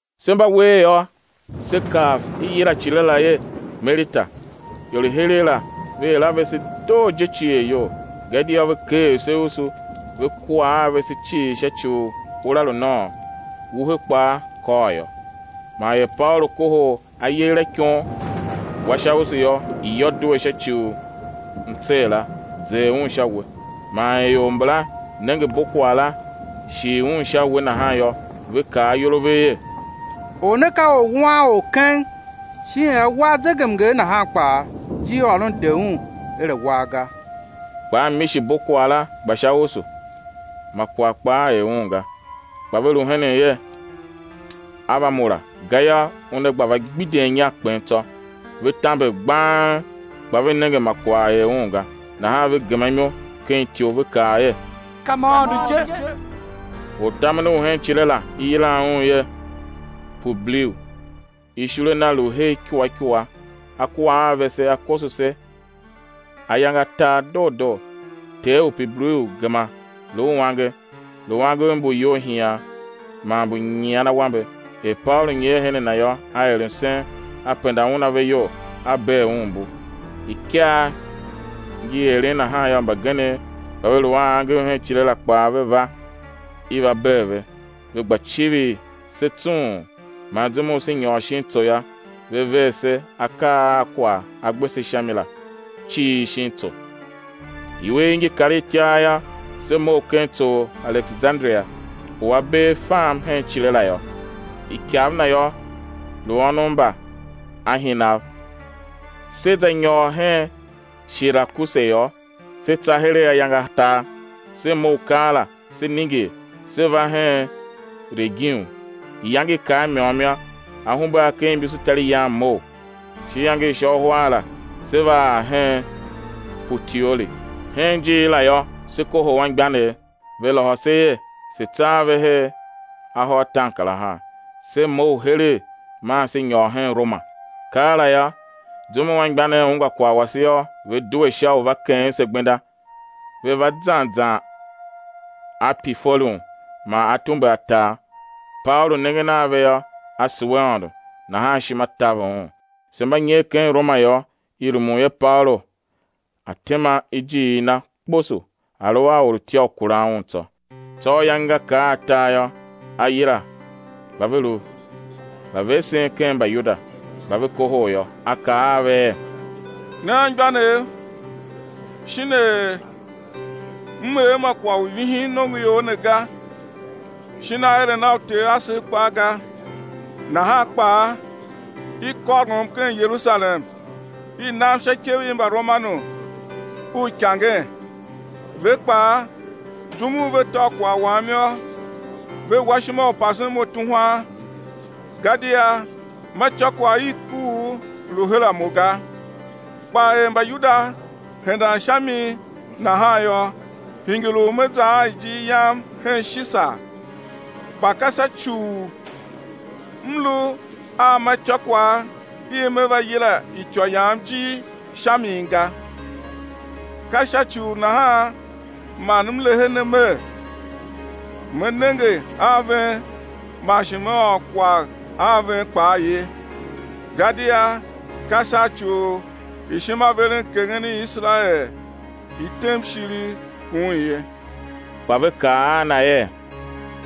Se mba wer yô, se kav i yilan icile la er Melita. Ior i heregh la ve er a vese doo je cier iyol, gadia ve keer se usu, ve kua a vese cii sha ci u ura lu nôôn, wuhe kpaa kôr yô. Man er Paulu kohol ayegher a ikon, wa sha usu yô, iyô due sha ci u mtsee la, zer un sha uwe. Man er ior mbala nenge bokwagh la shil un sha uwe nahan yô, ve kaa ayol a ve er: Or ne ka orwuanor keng; shin er a war zegemnger nahan kpaa, ijirôron de un er a̱ war ga. Kpa a mishi bokwagh la gba sha usu, ma kwagh kpaa er un ga. Kpa ve lu henen er, á va mura, gayô, una gba va gbidyen inya, kpen tsô. Ve tamber gbang, kpa ve nenge ma kwagh er un ga, nahan ve gema imo ken ityou ve kaa er: Ka ma aôndo je. Ortamen u hen icile la, i yilan un er Publiu, ishule na lu her ikua ikua, a kua a vese, a koso se ayange atar doo doo. Ter u Publiu gema lu uange, lu angev mbu iyolhian, man mbu nyian awambe. Er Paulu nyer her a na yô, a er msen, a penda un ave iyol, a bee un mbu. Ikaa ngi eren nahan yô, mbagenev mba ve lu a angev hen icile la kpaa, ve va, i va bee ve; ve gba civir se tsung; man zum u se nyôr shin tso yô, ve ver se akaa a kwagh a gbe se sha mi la cii shin tso. Iwer ngi kar itiar yô, se mough ken tso u Alekesanderia u a bee fam hen icile la yô, ikav na yô, lu Ônov mba Ahinav. Se za nyôr hen Shirakuse yô, se tsa heregh ayange atar. Se mough keela, se ningir, se va hen Regium; iyange i kar i môm yô, ahumbe a ken imbusutariyan mough, sha iyange i sha uhar la se va ar hen Putioli. Hen ijiir la yô, se kohol anmgbianev, ve lôhô se er, se̱ tsa a ve ahô ataankarahar. Se mough heregh maa se nyôr hen Roma. Keela yô, zum u anmgbianev ungwa kwagh wase yô, ve due sha u va keghen se gbenda, ve va zan zan Api Forum man Atumbe Atar. Paulu nengen a ve yô, a sugh Aôndo, nahan ishima taver un. Se mba nyer ken Roma yô, i rumun er Paulu a̱ tema ijiir na kposo a̱ lu a orutya u kuran un tsô. Tsô ayange nga kar atar yô, a yila mba ve lu mbavesen ken Mbayuda. Mba va kohol yô, a kaa a ve er: Ne anmgbianev shin er m er ma kwagh u vihin nongoior ne ga, shin aeren a uter asev kpaa ga, nahan kpaa i kôrom ken Yerusalem i nam sha ikev i Mbaromanu uikangen. Ve kpaa, zum u ve tôv kwagh wam yô, ve wa ishima u pasen mo tuhwan, gadia ma ityôkwagh i kuugh lu her a mo ga. Kpa er Mbayuda hendan sha mi nahan yô, hingir u me za a ijir yam hen Shisar, kpa ka sha ci u m lu a ma ityôkwagh i me va yila ityô yam ijir sha mi ga. Ka sha ci u nahan man m lehe ne mer, me nenge a ven, man shi me ôr kwagh a ven kpaa ye, gadia ka sha ci u ishimaverenkeghen i Iserael i tem ishiligh kun ye. Kpa ve kaa a na er: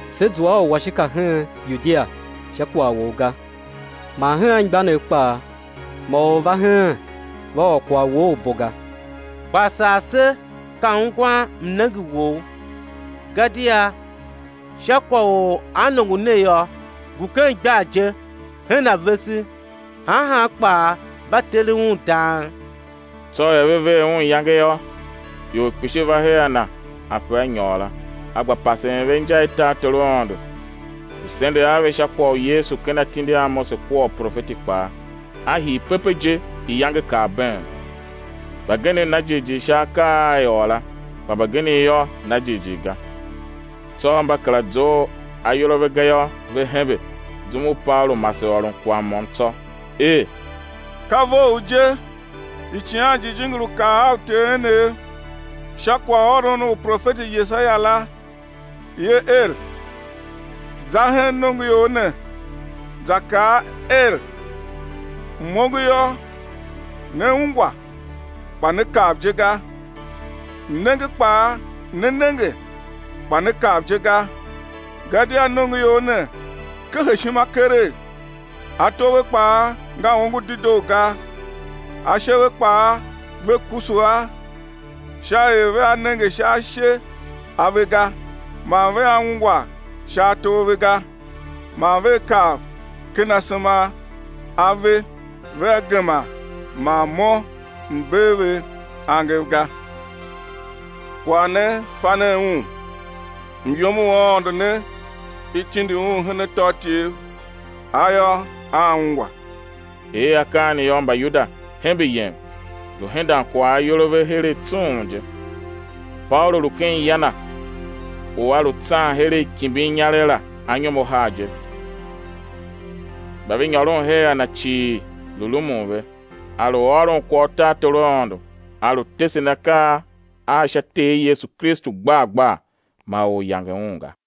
Se zua a uwashika hen Yudia sha kwagh wou ga, man hen anmgbianev kpaa ma or va heen, va ôr kwagh wou u bo ga. Kpa sar se ka ungwan mnenge wou; gadia sha kwagh u annongo ne yô, ngu ken igbar je hen a vese, han han kpaa mba teren un dang. Tsô er ve ver un iyange yô, ior kpishi va her a na ape a nyôr la; a gba pasen ve inja i tartor u Aôndo, lu sendegh a ve sha kwagh u Yesu ken atindi a Mose kua uprofeti kpaa, a hii pepe je, iyange kar been. Mbagenev na jighjigh sha akaa a i ôr la; kpa mbagenev yô, na jighjigh ga. Tsô mba kera zough ayol a ve ga yô, ve hembe, zum u Paulu mase ôron kwagh môm tsô, er: Ka vough je Icighan Jijingi lu kaa a uter enev sha kwaghôron u profeti Yesaia la, ye er: Za hen nongoior ne, za kaa wer: M-ongo yô, né ungwa, kpa né kav je ga. Mnenge kpaa, né nenge, kpa né kav je ga. Gadia nongoior ne kehe ishima keregh, ato ve kpaa nga ongo dedoo ga; ashe ve kpaa ve kusu a, sha er vea nenge sha ashe a ve ga, man vea ungwa sha ato a ve ga, man vea kav ken asema a ve vea gema man Mo M̱ bee ve angev ga. Kwagh ne, fa nen un, myom u Aôndo ne i tindi un hen atôatyev, a yô, aa ungwa. [ Er akaa ne yô, Mbayuda hembe yem, lu hendan kwagh ayol a ve heregh tsung je.] Paulu lu ken ya na u a lu tsan heregh kimbin inyaregh la anyom ahar je; mba ve nyôron her a na cii lu rumun ve. A̱ lu ôron kwagh u tartor u Aôndo, a lu tesen akaa a sha Ter Yesu Kristu gbar gbar, ma or yange un ga.